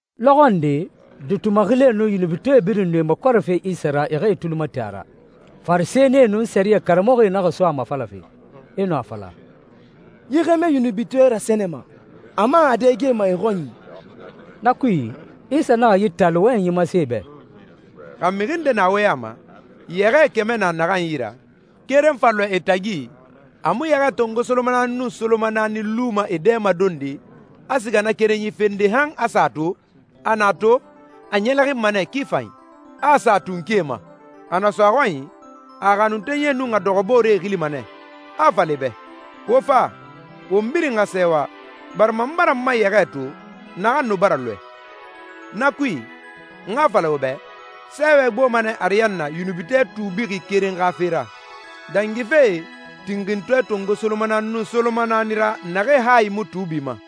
Lɔxɔ nde, duuti maxilie nun yunubitɔɛe birin nu e makɔrɛfe Isa ra e xa e tuli mati a ra. Farisɛnie nun sɛriyɛ karamɔxɔe naxa so a mafalafe, e nu a fala, «Yi xɛmɛ yunubitɔɛe rasɛnɛma, a man a dɛgema e xɔnyi.» Na kui, Isa naxa yi taali wɔyɛnyi masen e bɛ, «Xa mixi nde na wo ya ma, yɛxɛɛ kɛmɛ na naxan yi ra, keren fa lɔɛ e tagi, a mu yɛxɛɛ tongo solomanaani nun solomanaani luma e dɛmadonde, a siga na kerenyi fende han a sa a to? A na a to, a ɲɛlɛxinma nɛ ki fanyi, a a sa a tunkie ma. A na so a xɔnyi, a a xanuntenyie nun a dɔxɔbooree xilima nɛ, a a fala e bɛ, ‹Wo fa, won birin xa sɛɛwa, barima n bara n ma yɛxɛɛ to, naxan nu bara lɔɛ!› Na kui, n xa a fala wo bɛ, sɛɛwɛ gboma nɛ ariyanna yunubitɔɛ tuubixi keren xa fe ra, dangife tinxintɔɛ tongo solomanaani nun solomanaani ra naxee hayi mu tuubi ma.»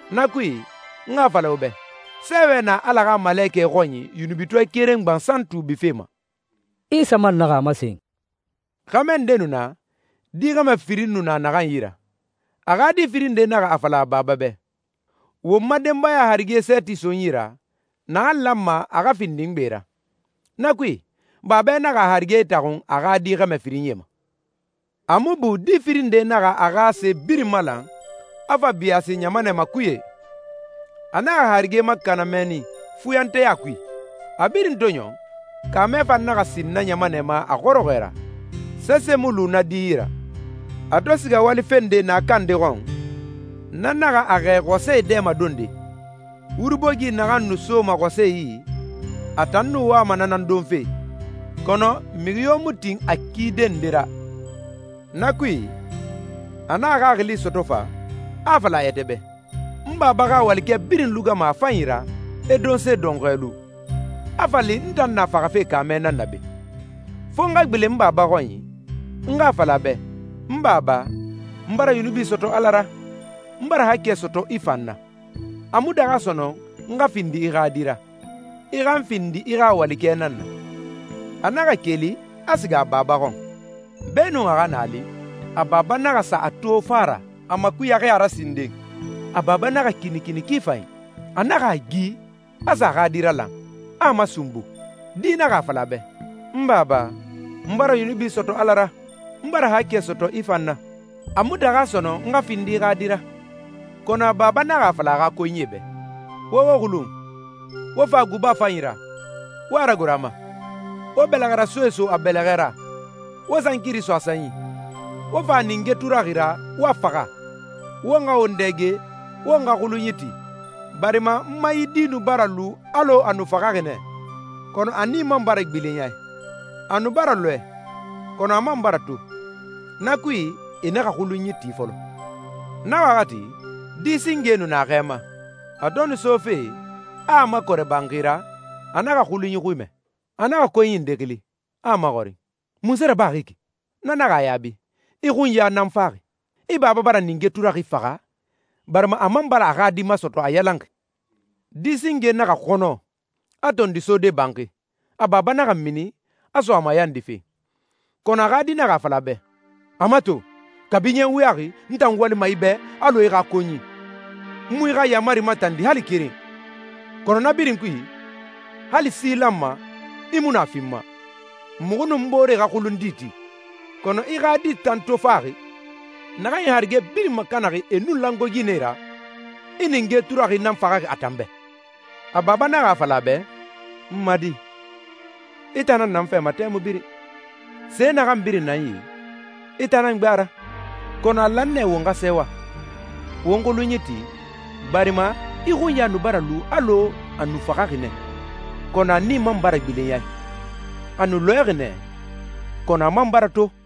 Na kui, n xa a fala wo bɛ, sɛɛwɛ na Ala xa malekɛe xɔnyi yunubitɔɛ keren gbansan tuubife ma.» Isa man naxa a masen, «Xɛmɛ nde nu na, di xɛmɛ firin nu naxan yi ra. A xa di firin nde naxa a fala a baba bɛ, ‹Won ma denbaya harige sɛɛti so n yi ra, naxan lanma a xa findi n gbe ra.› Na kui, babɛ naxa a harige itaxun a xa di xɛmɛ firinyie ma.» «A mu bu di firin nde naxa a xa se birin malan, a fa biyaasi ɲamanɛ makuye. A naxa a harige makana mɛnni, fuyanteya kui. A birin to ɲɔn, kaamɛ fan naxa sin na ɲamanɛ ma a xɔrɔxɔɛ ra, sese mu lu na di yi ra. A to siga wali fende naaka nde xɔn, na naxa a xɛɛ xɔsɛe dɛmadonde. Wuri bogi naxan nu soma xɔsɛe yi, a tan nu wama na nan donfe, kɔnɔ mixi yo mu tin a kide nde ra.» «Na kui, a naxa xaxili sɔtɔ fa, a a fala a yɛtɛ bɛ, ‹N baba xa walikɛ birin lugama a fanyi ra, e donse dɔnxɔɛ lu, a fa li n tan na faxafe kaamɛ nan na be! Fo n xa gbilen n baba xɔnyi, n xa a fala a bɛ, N baba, n bara yunubi sɔtɔ Ala ra, n bara haakɛ sɔtɔ i fan na. A mu daxa sɔnɔn n xa findi i xa di ra. I xa n findi i xa walikɛ nan na.› A naxa keli, a siga a baba xɔn.» «Beenun a xa naa li, a baba naxa sa a to fa ra, a makuyaxi a ra sinden. A baba naxa kinikini ki fanyi. A naxa a gi, a sa a xa di ralan, a a masunbu. Di naxa a fala a bɛ, ‹N baba, n bara yunubi sɔtɔ Ala ra, n bara haakɛ sɔtɔ i fan na. A mu daxa sɔnɔn n xa findi i xa di ra.›» «Kɔnɔ a baba naxa a fala a xa konyie bɛ, ‹Wo wo xulun, wo fa guba fanyi ra, wo a ragoro a ma. Wo bɛlɛxɛrasoe so a bɛlɛxɛ ra, wo sankiri so a sanyi. Wo fa ninge turaxi ra, wo a faxa. Won xa won dɛge, won xa xulunyi ti, barima n ma yi di nu bara lu alɔ a nu faxaxi nɛ, kɔnɔ a nii man bara gbilen a i. A nu bara lɔɛ, kɔnɔ a man bara to.› Na kui, e naxa xulunyi ti fɔlɔ.» «Na waxati, di singe nu na xɛ ma. A to nu sofe, a a makɔrɛ banxi ra, a naxa xulunyi xui mɛ. A naxa konyi nde xili, a a maxɔrin, ‹Munse rabaxi yi ki?› Na naxa a yaabi, ‹I xunya nan faxi. I baba bara ninge turaxi faxa, barima a man bara a xa di masɔtɔ a yalanxi.› Di singe naxa xɔnɔ, a tondi sode banxi. A baba naxa mini, a so a mayandife, kɔnɔ a xa di naxa a fala a bɛ, ‹A mato, kabi ɲɛ wuyaxi n tan walima i bɛ alɔ i xa konyi, n mu i xa yaamari matandi hali keren. Kɔnɔ na birin kui, hali si lanma, i mu nu a fi n ma, muxu nun n booree xa xulun di ti. Kɔnɔ i xa di tan to faxi, naxan i harige birin makanaxi e nun langoe ginɛe ra, i ninge turaxi nan faxaxi a tan bɛ!›» «A baba naxa a fala a bɛ, ‹N ma di, i tan na n fɛ ma tɛmui birin. Se naxan birin na n yi, i tan nan gbe a ra. Kɔnɔ a lan nɛ won xa sɛɛwa, won xulunyi ti, barima i xunya nu bara lu alɔ a nu faxaxi nɛ, kɔnɔ a nii man bara gbilen a i. A nu lɔɛxi nɛ, kɔnɔ a man bara to.›»